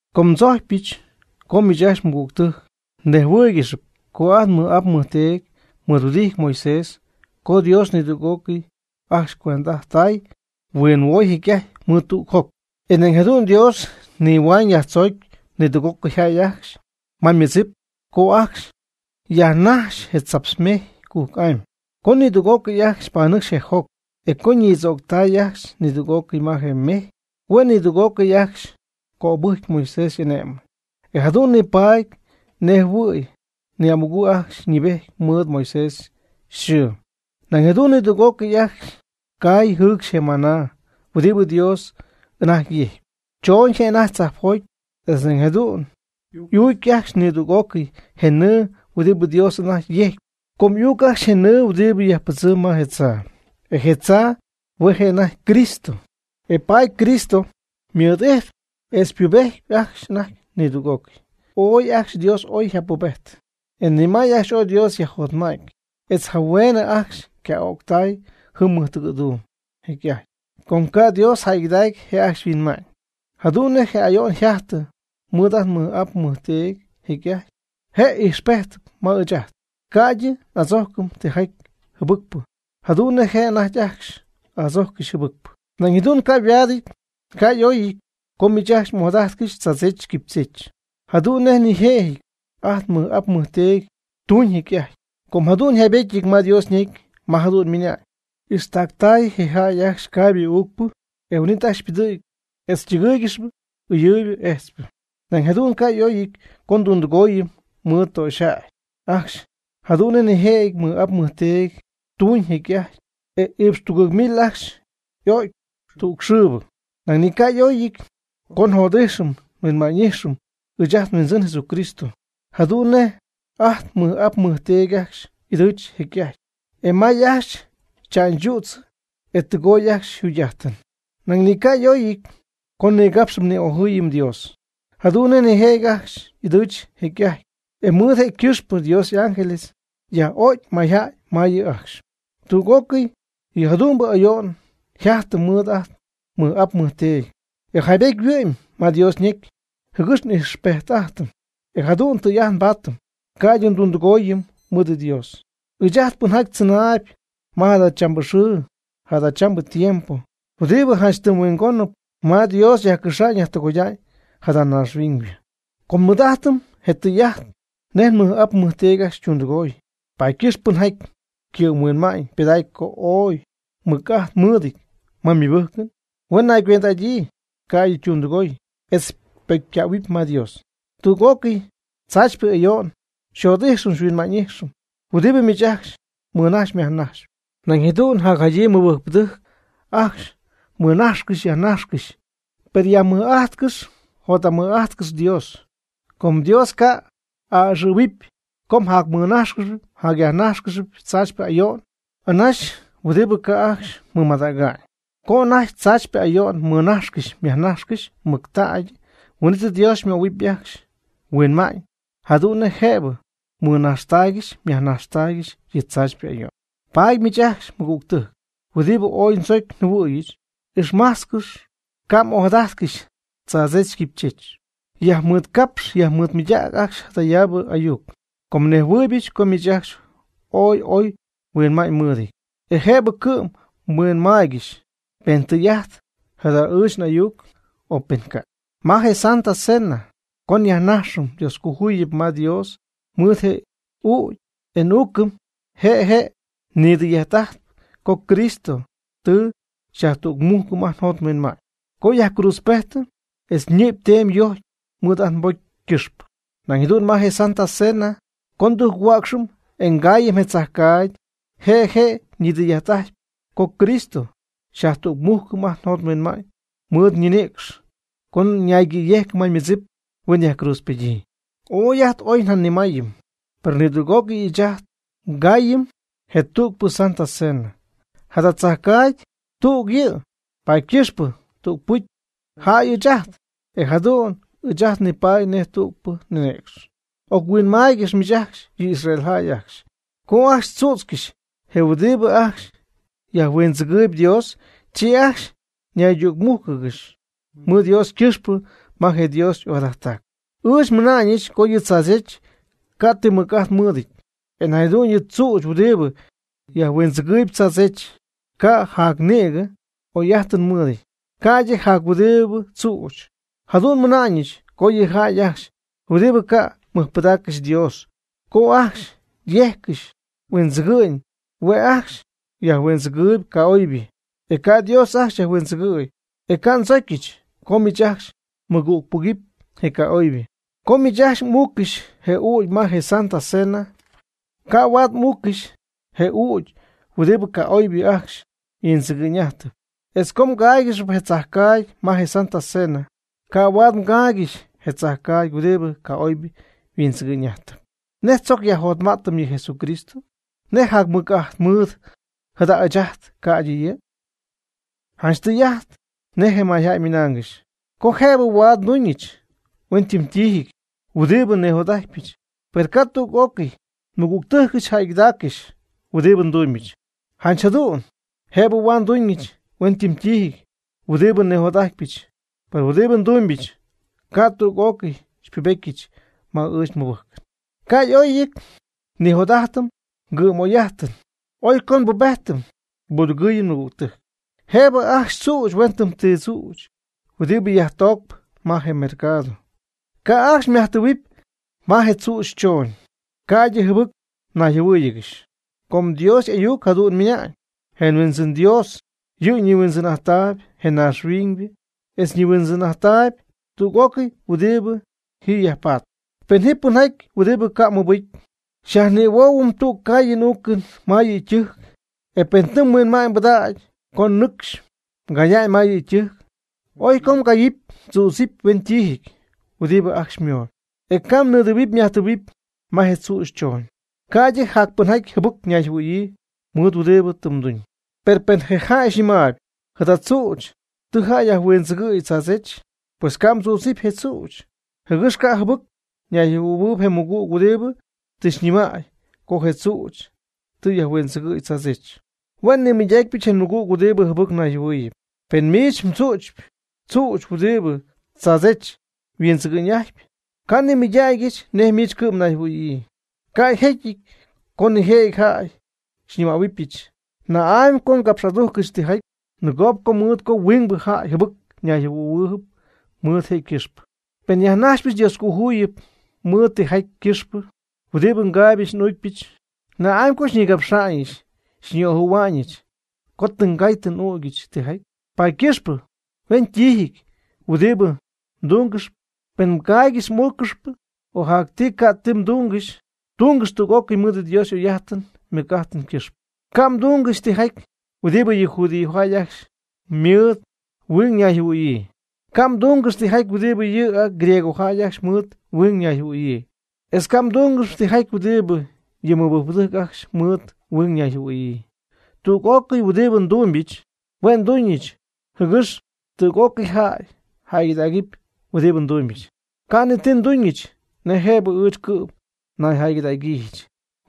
Com ndzojcypɨch co miich ajcxy mɨgügtɨjc mnejhuɨ́ɨygɨxɨpy co ajt nmɨj'ap nmɨjteedy mɨɨd yhuɨdijty Moisés co Dios nidüg'ócɨy ajcxy cuend'ajttay, huinhuoy jecy'ajty mɨɨd tüg joc. E nañ jadu'n Dios yajnihuañ yajtzoocy nidüg'ócɨy ajcxy ma ymɨdzip co ajcxy yajnajxy je tzaptz mejy cujc'amy. Co nidüg'ócɨy ajcxy panɨcxy je joc, e co ñïdzooctay ajcxy nidüg'ócɨy ma je mejy, hue' nidüg'ócɨy ajcxy cöbɨjcy Moisés y'ane'mɨn, e jadu'n nipaady nej jɨhuɨ̈y ni'amugɨ̈ ajcxy yñɨɨbejty mɨɨd Moisés yxɨɨ. Nañ jadu'n nidüg'ócɨy ajcxy caay jɨɨcxy je maná huɨdibɨ Dios anajty yejcpy, choñ je' anajty tzajpjoty. Etz nañ jadu'n y'uuc ajcxy nidüg'ócɨy je nɨɨ huɨdibɨ Dios anajty yejcpy, com y'uuc ajcxy je nɨɨ huɨdibɨ yajpɨdzɨm ma je tzaa. E je tzaa hue' je' anajty Cristo, e paady Cristo ymɨɨd'ijtpy etz ypubejtpy ajcxy anajty nidüg'ócɨy. Oy ajcxy Dios ooy yjapubejtɨ, e ni may ajcxy ooy Dios yajjotma'ty, etz jahueen ajcxy yca'öctay jɨm mɨjtɨgɨ̈duum jecy'ajty, com ca' Dios jäygɨdacy je' ajcxy yhuinma'ñ. Jadu'n nej je ayo'n yjajtɨ mɨɨd ajt nmɨj'ap nmɨjteedy jecy'ajty, je' ijxpejtɨp ma ɨɨch ajt, ca'ydɨ n'adzojcɨm tijaty jɨbɨcpɨ, jadu'n nej je' anajty ajcxy adzojccɨx jɨbɨcpɨ. Nañ jadu'n ca' yhuaadɨty ca' y'oyɨty co miich ajcxy m'ojadajtcɨxy tzaadzech quipychech jadu'n nej nijëjɨty ajt nmɨj'ap nmɨjteedy tuñ jecy'ajty. Com jadu'n yjaybetyɨty ma Dios ñecy ma jadu'n ymɨna'ñ: “Ixtactay je jäy ajcxy caaybɨ uucpɨ, e huin'it ajcxy ypɨdɨ̈gy etz ytɨgɨɨygɨxy ɨyɨɨybɨ ejtzpɨ.” Nañ jadu'n ca' y'oyɨty co ndundɨgooyɨm mɨɨd töxyjäy ajcxy jadu'n nej nijëjɨty nmɨj'ap nmɨjteedy tuñ jecy'ajty, e iipx tugɨɨg mil ajcxy y'o'cy tüg xɨɨbɨ. Nañ ni ca' y'oyɨty co njot'ijxɨm nhuinma'ñ'ijxɨm ɨɨch ajt nHuindzin Jesucristo, jadu'n nej ajt nmɨj'ap nmɨjteedy ajcxy ɨdɨɨch jecy'ajty, e may ajcxy tza'ñchüdzɨ, e ytɨgooy ajcxy yjugy'ajtɨn. Nañ ni ca' y'oyɨty co nnigapxɨm ni'ojɨɨyɨm Dios, jadu'n nej nijëjɨty ajcxy ɨdɨɨch jecy'ajty, e mɨɨd je' ycɨxpɨ Dios y'ángel yaj'o'cy mayjäy ma yɨ' ajcxy. Tüg'ócɨy yɨ jadu'mbɨ ayo'n yjajtɨ mɨɨd ajt nmɨj'ap nmɨjteedy, e jaybety yhuɨ'my ma Dios ñecy, jɨgɨx n'ijxpejt'ajtɨm, e jadu'n tɨy'ajt nbaatɨm, ca'ydɨ ndundɨgooyɨm mɨɨd Dios, ɨɨch ajt pɨnjaty tzɨnaayb ma jadachambɨ xɨɨ jadachambɨ tiempo huɨdibɨ janch tɨm huingónɨp ma Dios yajcɨxa'ñ yajtɨgoya'ñ jada naaxhuiñybɨ. Com nmɨɨd'ajtɨm je tɨy'ajt nej nmɨj'ap nmɨjteedy ajcxy ytundɨgooy, paady ycɨxp pɨnjaty ycɨ'mhuinma'ñ pɨdacp co ooy mɨc'ajt mɨɨdɨty ma ymɨbɨjcɨn, huen naygüend'adyii, ca'ydɨ ytundɨgoy etz ypocycähuɨpy ma Dios. Tüg'ócɨy tzaachypɨ ayo'n, jot'ijxɨn huinma'ñ'ijxɨn huɨdibɨ miich ajcxy mmɨnajxyp myajnajxyp, nañ jadu'n jacjadyii mɨbɨjcpɨdɨjc ajcxy mɨnajxcɨxy yajnajxcɨxy. Per yajmɨj'ajtcɨx jot'amɨj'ajtcɨx Dios, com Dios ca' a'ɨxɨ̈huɨp co mjacmɨnájxcɨxɨpy mjacyajnájxcɨxɨpy tzaachypɨ ayo'n anaxy huɨdibɨ ca' ajcxy mmɨmadäga'ñ. Co anajty tzaachypɨ ayo'n mmɨnajxcɨxy myajnajxcɨxy mɨctägy, huin'it Dios xymöhuɨpy ajcxy huinma'ñ jadu'n nej jëbɨ mmɨnaxtaygɨxy myajnaxtaygɨxy yɨ tzaachypɨ ayo'n. Paady miich ajcxy mɨgügtɨjc, huɨdibɨ ooy ndzocy njɨhuɨ̈yɨch, ixmajtzcɨxy ca' m'ojadajtcɨxy tzaadzech quipychech. Nyajmɨɨdcapxy nyajmɨɨdmɨydacpy ajcxy jadayaabɨ ayuc, com nejhuɨɨybɨch co miich ajcxy ooy oy huinma'ñ mmɨɨdɨty. E jëbɨ cɨ'm mhuinmaaygɨxy pen tɨy'ajt jada ɨɨch n'ayuc, o pen ca'. Ma je “Santa Cena” co nyajnajxɨm Dioscojuyip ma Dios mɨɨd je ügy, e n'uucɨm. Je' je' ñidɨy'ajt'ajtpy co Cristo tɨ xyajtügmújcɨm ajt njot nhuinma'ñ co yajcruudzpejtɨ etz ñɨ'py yteemy yojcy mɨɨd ajt nbocy ycɨxpɨ. Nañ jadu'n ma je “Santa Cena” co ndujchuäcxɨm, e ngaayɨm je tzajcaagy, je' je' ñidɨy'ajt'ajtpy co Cristo xyajtügmujcɨm ajt njot nhuinma'ñ mɨɨd ñinïcx co ñaygɨ̈yejcɨ ma ymɨdzip huen yajcruudzpedyii. Oy ajt ooy njanimaayɨty, per nidüg'ócɨy ɨɨch ajt ngaayɨm je tügpɨ “Santa Cena” tzajcaagy. Jada tzajcaagy tüg yɨ', paady ycɨxpɨ tügpɨcy jäy ɨɨch ajt, e jadu'n ɨɨch ajt nipaady nej tügpɨ ninïcx. Oc-huinmaaygɨxy miich ajcxy yɨ Israel jäy ajcxy, co ajcxy tzützcɨxy je huɨdibɨ ajcxy yajhuindzɨgɨɨyb Dios, chi ajcxy naydücmújcɨgɨxy mɨɨd Dios ycɨxpɨ ma je Dios ojadajttac. Ɨɨch nmɨna'ñɨch co yɨ tzaadzech ca' ti mɨc'ajt mɨɨdɨty, e nañ jadu'n yɨ tzüch huɨdibɨ yajhuindzɨgɨɨyb tzaadzech ca' jac nïgɨ oy'ajtɨn mɨɨdɨty, ca'ydɨ jac huɨdibɨ tzüch. Jadu'n nmɨna'ñɨch, co yɨ jäy ajcxy huɨdibɨ ca' mɨjpɨdaaccɨxy Dios, co ajcxy yejccɨxy yhuindzɨgɨ'ñ, hue' ajcxy yajhuindzɨgɨɨyb ca'oybɨ, e ca' Dios ajcxy yajhuindzɨgɨ̈y. E ca' ndzocyɨch co miich ajcxy mɨgügpɨgɨpy je ca'oybɨ. Co miich ajcxy m'uuccɨxy je ügy ma je “Santa Cena”, ca' huaad m'uuccɨxy je ügy huɨdibɨ ca'oybɨ ajcxy yhuindzɨgɨ'ñ'ajtɨpy. Etz co mgaaygɨxy je tzajcaagy ma je “Santa Cena”, ca' huaad mgaaygɨxy je tzajcaagy huɨdibɨ ca'oybɨ yhuindzɨgɨ'ñ'ajtɨp. ¿Nej tzoc yajjotma'tɨm yɨ Jesucristo? ¿Nej jacmɨc'ajt mɨɨd jada' ɨɨch ajt, ca'ydɨ yɨ'? Janch tɨy'ajt nej jay ymɨnaangɨxy co jëbɨ huaad nduñɨch huentiijɨty huɨdibɨ nijot'ajtpyɨch, per ca' tüg'ócɨy nmɨgügtɨjcɨch jäygɨdaaccɨxy huɨdi ndumybɨch. Janch jadu'n jëbɨ huaad nduñɨch huentiijɨty huɨdibɨ nijot'ajtpyɨch, per huɨdibɨ ndumybɨch ca' tüg'ócɨy xypubetyɨch ma ɨɨch nmɨbɨjcɨn. Ca' y'oyɨty nnijot'ajtɨm ngɨ'm'oy'ajtɨn. Oy co nbubejtɨm nbudɨgɨɨyɨm nmɨgügtɨjc. Jëbɨ ajcxy mdzüch huen ti tzüch huɨdibɨ yajtoocp ma je mercado. Ca' ajcxy myajtɨɨhuɨpy ma je tzüch chooñ, ca'ydɨ jɨbɨc mnayjɨhuɨ́ɨyɨgɨxy. Com Dios y'ayuc jadu'n ymɨna'ñ: “Je Huindzɨn Dios yɨ' nihuindzɨn'ajtp je naaxhuiñybɨ, etz ñihuindzɨn'ajttaayb tüg'ócɨy huɨdibɨ ji yajpatp.” Pen jɨm pɨnjaty huɨdibɨ ca' ymɨbɨcy, xyajnihuohuɨ̈y tüg caayɨn uucɨn ma yɨ' ytɨjc, e pen tɨ mhuinma'ñ mbɨdägy co nɨcxy mgaya'ñ ma yɨ' ytɨjc, oy co mgaayɨpy mdzüdzɨp huentiijɨty huɨdibɨ ajcxy xymooyb. E ca' mnidɨɨhuɨpy myajtɨɨhuɨpy ma je tzüch chooñ, ca'ydɨ jac pɨnjaty jɨbɨc ñayjɨhuɨ̈yii mɨɨd huɨdibɨ tɨ mduñ. Per pen je jäy xyñɨmaayb: “Jada tzüch tɨ jäy yajhuindzɨgɨ̈y tzaadzech.” Pues ca' mdzüdzɨp je tzüch, jɨgɨx ca' jɨbɨc ñayjɨhuɨ̈huɨɨyb je mɨgüg huɨdibɨ tɨ xyñɨmäy co je tzüch tɨ yajhuindzɨgɨ̈y tzaadzech. Hue' nimɨydacypɨch je mmɨgüg huɨdibɨ jɨbɨc nayjɨhuɨ̈huɨɨyb pen miich mdzu'chpyɨ tzüch huɨdibɨ tzaadzech yhuindzɨgɨ'ñ'ajtp. Ca' nnimɨydägyɨch nej miich cɨ'm mnayjɨhuɨ̈yii. Ca' yjecyɨty co nijëjɨty jäy xyñɨmähuɨbɨch: “¿Na'amy co xycapx'adujcɨch tijaty nɨgoob mɨɨd co huingbɨ jäy jɨbɨc ñayjɨhuɨ̈yii mɨɨd jëgɨxpɨ? Pen nyajnajxypɨch Dioscojuyip mɨɨd tijaty ycɨxpɨ huɨdibɨ ngaaybɨch n'uucypɨch, ¿na'amy co xyñigapxa'ñɨch xyñi'ojɨ̈hua'ñɨch co tɨ ngay tɨ n'ügyɨch tijaty?” Paady ycɨxp huentiijɨty huɨdibɨ mdungɨxyp, pen mgaaygɨxyp m'uuccɨxyp, o jac ti ga ti mdungɨxy, tungɨx tüg'ócɨy mɨɨd Dios y'oy'ajtɨn ymɨj'ajtɨn ycɨxpɨ. Ca' mdúngɨxɨpy tijaty huɨdibɨ yɨ judíojäy ajcxy mɨɨd huing ñayjɨhuɨ̈yii. Ca' mdúngɨxɨpy tijaty huɨdibɨ yɨ griegojäy ajcxy mɨɨd huing nayjɨhuɨ̈yii. Etz ca' mdúngɨxɨpy tijaty huɨdibɨ yɨ mɨbɨjcpɨdɨjc ajcxy mɨɨd huing ñayjɨhuɨ̈yii. Tüg'ócɨy huɨdibɨ ndúmybɨch, hue' nduñɨch jɨgɨx tüg'ócɨy jäy jäygɨdägɨpy huɨdibɨ ndumybɨch. Ca' ni ti nduñɨch nej jëbɨ ɨɨch cɨ'm nayjäygɨdägyiijɨch.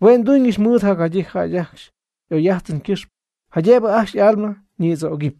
Hue' nduñɨch mɨɨd jacjadyii jäy ajcxy y'oy'ajtɨn ycɨxpɨ, jaydëbɨ ajcxy y'alma ñïdzögɨpy.